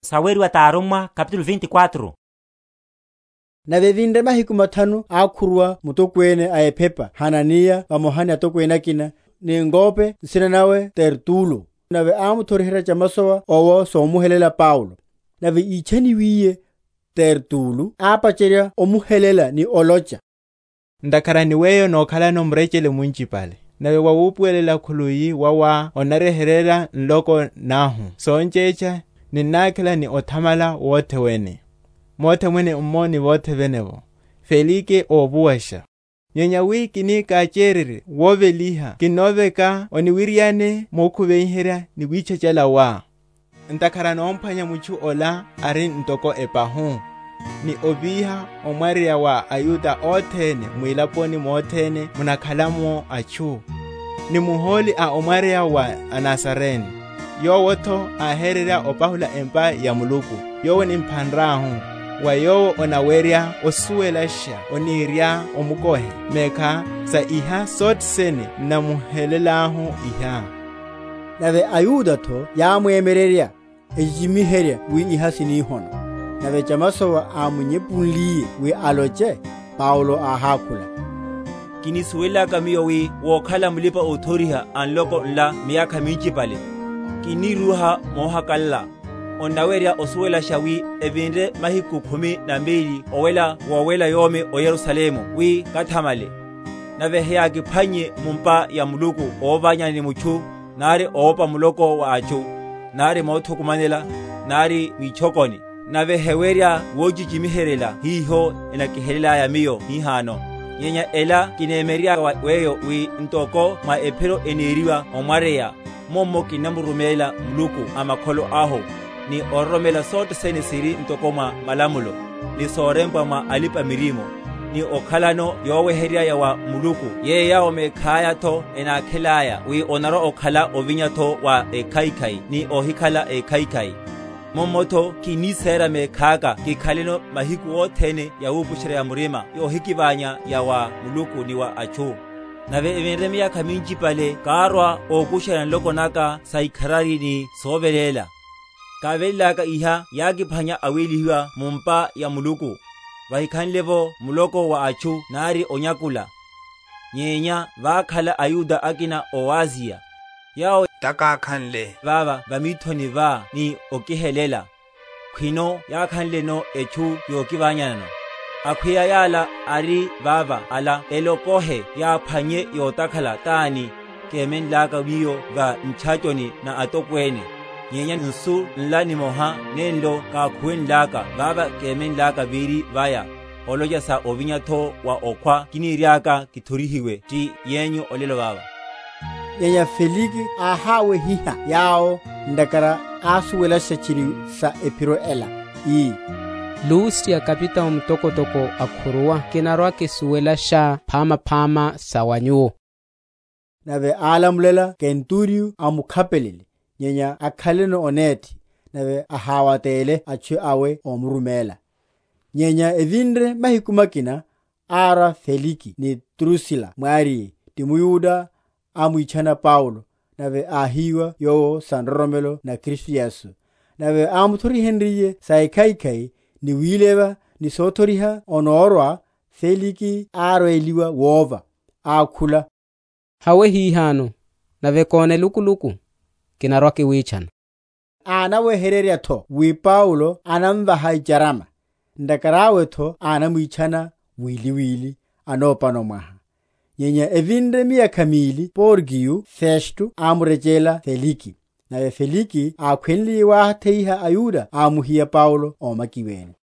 Mulachu wa Paulo va mithoni va Felike. Nave evinre mahiku mathanu ákhuruwa mutokwene a ephepa Hananiya vamoha ni atokwene akina, ni ng’wope nsina nawe Tertulo; nave ámuthoriherya chamasowa owo somuhelela Paulo. Nave ítchaniwiye, Tertulo ápacherya omuhelela ni olocha, Ntakhara ni weyo nokhalano murechele munchipale, nave mwa wupuwelela khuluwi wawá onnaryeheryela nloko nahu son’chetcha, ninnákhela ni othamala wothe wene, mothe mwene’mmo ni vothe vene’vo, Felike óvuwasha. Nyenya wi kini káchererye woveliha kinnoveka oniwiriane mokhuviherya ni witchachala wá. Ntakhara nomphwanya mutchu’la ari ntoko epahu, ni óvíha omwaryeya wa aYuda othene mwilaponi mothene munakhala’mo atchu, ni muhóli a omwaryeya wa aNazarene; yowo’tho áhérerya opahula empa ya Muluku: yowo nimphanrahu: wa yowo onawerya osuwelasha oniriá omukohe mekhá, sa iha sothene n’namuhelelahu iha. Nave aYuda’tho yámwemyererya, echichimiherya wi iha sini hono. Nave chamasowa ámunyephunliye wi aloche, Paulo áhákhula, Kinisuwelelaka miyo wi wokhala mulipa‐othoriha a nloko nla miyakha minchipale, kinírúha mohakalala; onnawerya osuwelasha wi evinre mahiku khumi na meliru owela wowela yomi o Yerusalemu wi kathamalele; nave heyákiphwannye mu’mpa ya Muluku óvanyana ni mutchu, nari ówopa muloko wa atchu, nari mothukumanela, nari mwitchokoni. Nave hewerya wochichimiheryela hiho enakihelelaya miyo hihano. Nyenya ela kinemyererya wa weyo, wi ntoko mwa Ephiro eneriwa omwaryeya, mummo kinnamuruméla Muluku a makholo ahu, ni ororomela sothe sene siri ntoko mwa malamulo, ni sorempwa mwa alipa‐miririmo; ni okhalano yoweheryerya ya wa Muluku yeyo yawo mekhaya’tho enákhelaya, wi onarwa‐okhala ovinya’tho wa ékhaikhai ni óhikhala ékhaikhai. Mummo’tho kinnisera mekhaka kikhaleno mahiku othene yawupusherya‐ya‐murima yohikiványa ya wa Muluku ni wa atchu. Nave evinre miyakha minchipale kárwa ókusherya nloko naka saikharari ni soveléla; kivelélaka iha yákiphwanya awélihiwa mu’mpa ya Muluku, vahikhanle’vo muloko wa atchu nari onyakula; nyenya vákhala aYuda akina ó Asiya, — yawo takákhanle vava va mithoni vá ni okihelela, khwino yakhanleno etchu yokivanyano. Akhweya yala ari vava ala elokohe yaphwannye yotakhala tani, kémenlaka miyo va ntchachoni na atokwene, nyenya nsu nla nimoharu, nenlo kákhuwenlaka vava kemenlaka véri vaya, olocha sa ovinya’tho wa okhwa kiniriaka kithorihiwe ti yenyu olelo vava. Nyenya Felike áháwehiha yawo, ntakhara ásuwelasha tchiri sa Ephiro ela, ii, Lusiya kapitao mutokotoko akhuruwa kinarwa‐kisuwelasha phamaphama sa wa nyuwo. Nave álamulela kenturiyo amukhapelele, nyenya akhaleno onethi, nave aháwatele atchu awe omuruméla. Nyenya evinre mahiku makina, árwa Felike ni Drusila mwariye, ti mYuda, amwitchana Paulo, nave áhíwa yowo sa nroromelo na Kristu Yesu. Nave ámuthorihenryiye sa ekhaikhai, ni wileva, ni sothoriha onórwa, Felike árweliwa wova, ákhula, Hawe hihano; nave kona elukuluku, kinarwa‐kiwitchana. Ánaweherya’tho wi Paulo anamvaha icharama: ntakhara awe’tho anamwitchana wili wili, anopano mwaha. Nyenya evinre miyakha mili Porkiyo Festo ámurechelela Felike; nave Felike ákhwenliye wátheiha aYuda ámuhiya Paulo ómakiwene.